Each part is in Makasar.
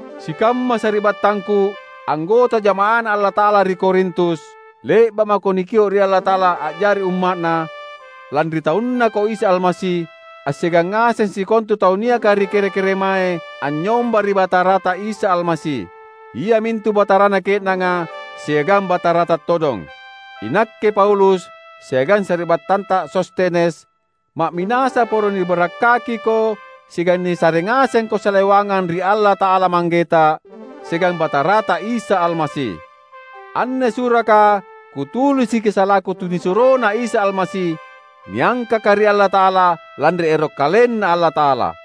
Sikamma sari’battangku, anggota jama’aNa Allata’ala ri Korintus! Le’ba’ mako nikio’ ri Allata’ala a’jari umma’Na, lanri taunNako Isa Almasi; assiagang ngaseng sikontu tau niaka ri kere-keremae anynyomba ri Batarata Isa Almasi, iamintu Batarana ke’nanga siagang Batarata todong. Inakke Paulus siagang sari’battanta Sostenes, ma’minasa poro nibarakkakiko siagang nisare ngasengko salewangang ri Allata’ala Manggeta, siagang Batara Isa Almasi. Anne suraka kutulisiki salaku tunisuroNa Isa Almasi, niangkaka ri Allata’ala, lanri ero’ KalenNa Allata’ala.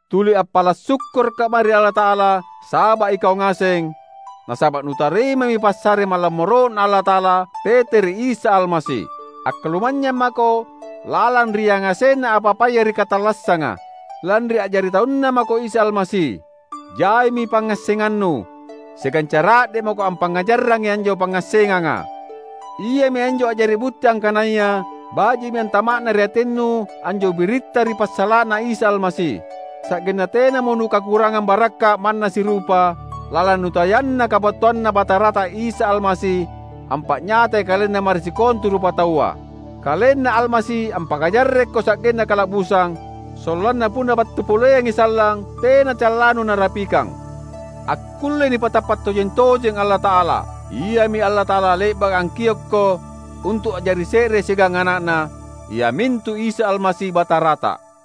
Tuli appala’ sukkurukka’ mae ri Allata’ala saba’ ikau ngaseng, nasaba’ nutarimami passare malammoro’Na Allata’ala, tete ri Isa Almasi. Akkalumanynyang mako lalang ri yangasenna apa-apaya ri katallassanga, lanri a’jari taunNa mako Isa Almasi. Jaimi pangngassengannu, siagang cara’de’ mako ampangngajarrangi anjo pangngassenganga. Iami anjo a’jari butti angkanaya baji’mi antama’na ri atinnu anjo biritta ri passala’na Isa Almasi; sa’genna tenamo nukakurangang barakka’ manna sirupa, lalang nutayanna kabattuanNa Batarata Isa Almasi ampa’nyatai KalenNa mae ri sikontu rupataua. KalenNa Almasi ampakajarrekko sa’genna kala’busang, sollanna punna battu poleangi sallang, tena callanu narapikang. Akkullei nipatappa’ tojeng-tojeng Allata’ala. Iami Allata’ala le’baka angkiokko untu’ a’jari se’re siagang Ana’Na, iamintu Isa Almasi, Batarata.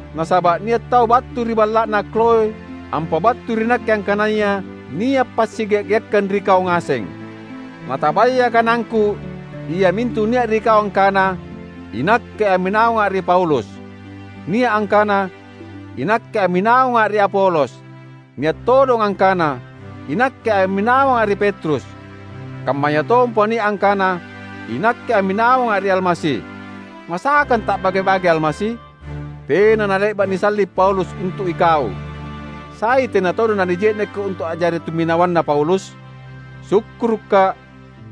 Nasaba’ nia’ tau battu ri balla’na Kloë ampabattui ri nakke angkanaya nia’ passigea’-geakkang ri kau ngaseng. Natabaya kanangku iamintu nia’ ri kau angkana, "Inakke amminawanga’ ri Paulus," nia’ angkana, "Inakke amminawanga’ ri Apolos," nia’ todong angkana, "Inakke amminawanga’ ri Petrus," kammayatompa nia’ angkana, "Inakke amminawanga’ ri Almasi." Masakang ta’bage-bagei Almasi? Tena nale’ba’ nisalli’ Paulus untu’ ikau! Sai tena todong nanije’nekko untu’ a’jari tumminawanna Paulus? Sukkurukka’,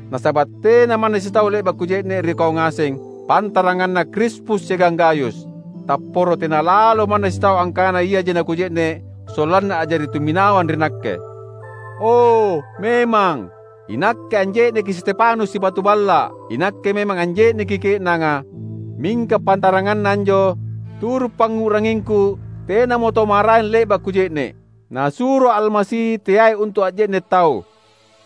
nasaba’ tena manna sitau le’ba’ kuje’ne’ ri kau ngaseng, pantaranganna Krispus siagang Gayus. Tapporo tena lalo manna sitau angkana iaji nakuje’ne’ sollanna a’jari tumminawang ri nakke. (O, memang! Inakke anje’neki Stefanus sibatu balla’.Inakke memang anje’neki ke’nanga. Mingka pantaranganna anjo, turu’ pangngu’rangingku tenamo tau maraeng le’ba’ kuje’ne’.) Nasuroa’ Almasi teai untu’ a’je’ne’ tau,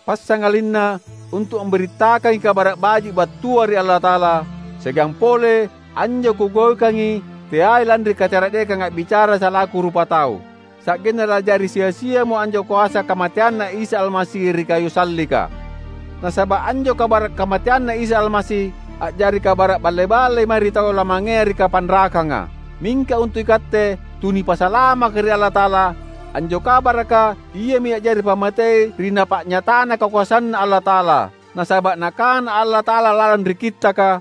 passangalinna untu’ ambirittakangi Kabara’ Baji’ battua ri Allata’ala, siagang pole, anjo kugaukangi teai lanri kacara’dekang a’bicara salaku rupatau, sa’genna la’jari sia-siamo anjo koasa kamateanNa Isa Almasi ri kayu sallika. Nasaba’ anjo kabara’ kamateanNa Isa Almasi a’jari kabara’ balle-ballei mae ri tau lamangea ri kapanrakanga. Mingka untu’ ikatte tu nipasalamaka ri Allata’ala, anjo kabaraka iami a’jari pammatei ri Napa’nyatana kakoasanNa Allata’ala. Nasaba’ Nakana Allata’ala lalang ri Kittaka,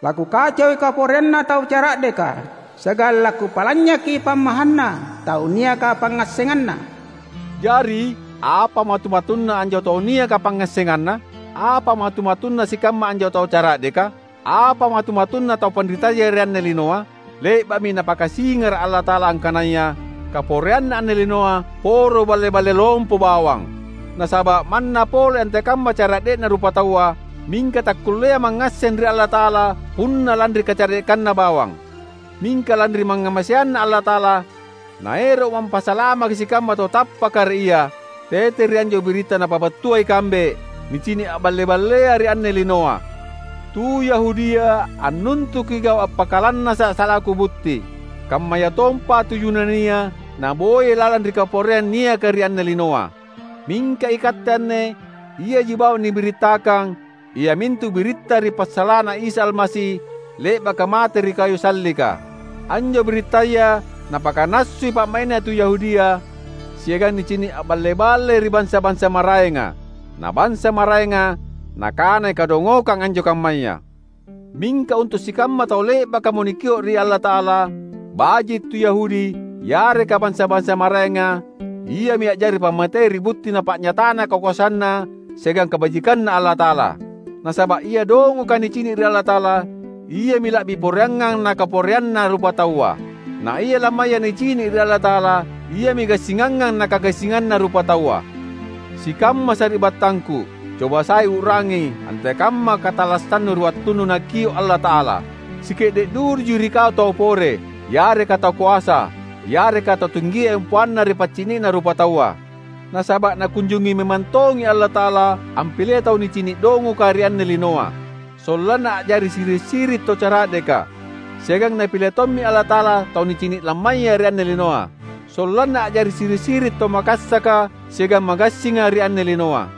"LaKukacoi kaporeanna tau cara’deka siagang laKupa’lanynyaki pammahanna tau niaka pangngassenganna." Jari, apa matu-matunna anjo tau niaka pangngassenganna? Apa matu-matunna sikamma anjo tau cara’deka? Apa matu-matunna tu panritaya ri anne linoa? Le’ba’mi Napakasingara’ Allata’ala angkanaya kaporeanna anne linoa poro balle-balle lompo bawang! Nasaba’ manna pole antekamma cara’de’na rupataua, mingka takkulleai mangngasseng ri Allata’ala punna lanri kacara’dekanna bawang. Mingka lanri mangngamaseanNa Allata’ala, Naero’mo ampasalamaki sikamma tau tappaka ri Ia, tete ri anjo biritta napabattua ikambe, nicini’ a’balle-ballea ri anne linoa. Tu Yahudia annuntuki gau’ appakalannasa’ salaku butti, kammayatompa tu Yunania naboyai lalang ri kaporeang niaka ri anne linoa. Mingka ikatte anne iaji bawang nibirittakang iamintu biritta ri passala’na Isa Almasi le’baka mate ri kayu sallika. Anjo birittaya napakanassui pa’mai’na tu Yahudia, siagang nicini’ a’balle-ballei ri bansa-bansa maraenga. Na bansa maraenga nakanai kadongokang anjo kammaya. Mingka untu’ sikamma tau le’bakamo nikio’ ri Allata’ala — baji’ tu Yahudi yareka bansa-bansa maraenga — iami a’jari pammatei ri butti Napa’nyatana kakoasanNa siagang kabajikanNa Allata’ala. Nasaba’ ia dongoka nicini’ ri Allata’ala, iami la’bi poreangngang nakaporeanna rupataua. Na ia lammaya nicini’ ri Allata’ala iami gassingangngang nakagassinganna rupataua. Sikamma sari’battangku! Cobasai u’rangi antekamma katallassannu ri wattunnu Nakio’ Allata’ala. Sike’de’ duduji ri kau tau pore, yareka tau koasa, yareka tau tinggia empoanna ri paccini’na rupataua. Nasaba’ Nakunjungi memang tongi Allata’ala ampilei tau nicini’ dongoka ri anne linoa; sollanna a’jari siri’-siri’ tau cara’deka. Siagang Napile tommi Allata’ala tau nicini’ lammaya ri anne linoa, sollanna a’jari siri’-siri’ tau makassaka siagang magassinga ri anne linoa.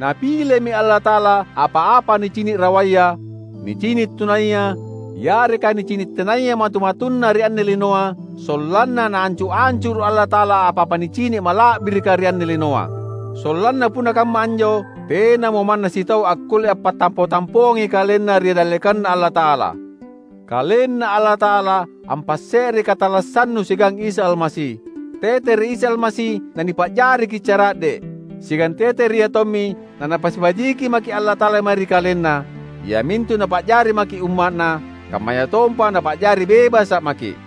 Napilemi Allata’ala apa-apa nicini’ rawaya, nicini’ tunaya, yareka nicini’ tenaya matu-matunna ri anne linoa, sollanna Naancu’-ancuru’ Allata’ala apa-apa nicini’ mala’birika ri anne linoa. Sollanna punna kamma anjo, tenamo manna sitau akkulle ampattampo-tampoangi kalenna ri dallekanNa Allata’ala. KalenNa Allata’ala ampasse’rei katallassannu siagang Isa Almasi. Tete ri Isa Almasi nanipa’jariki’ cara’de’. Siagang tete ri Iatommi naNapasibajiki maki’ Allata’ala mae ri KalenNa, iamintu Napa’jari maki’ umma’Na, kammayatompa Napa’jari bebasa’ maki’.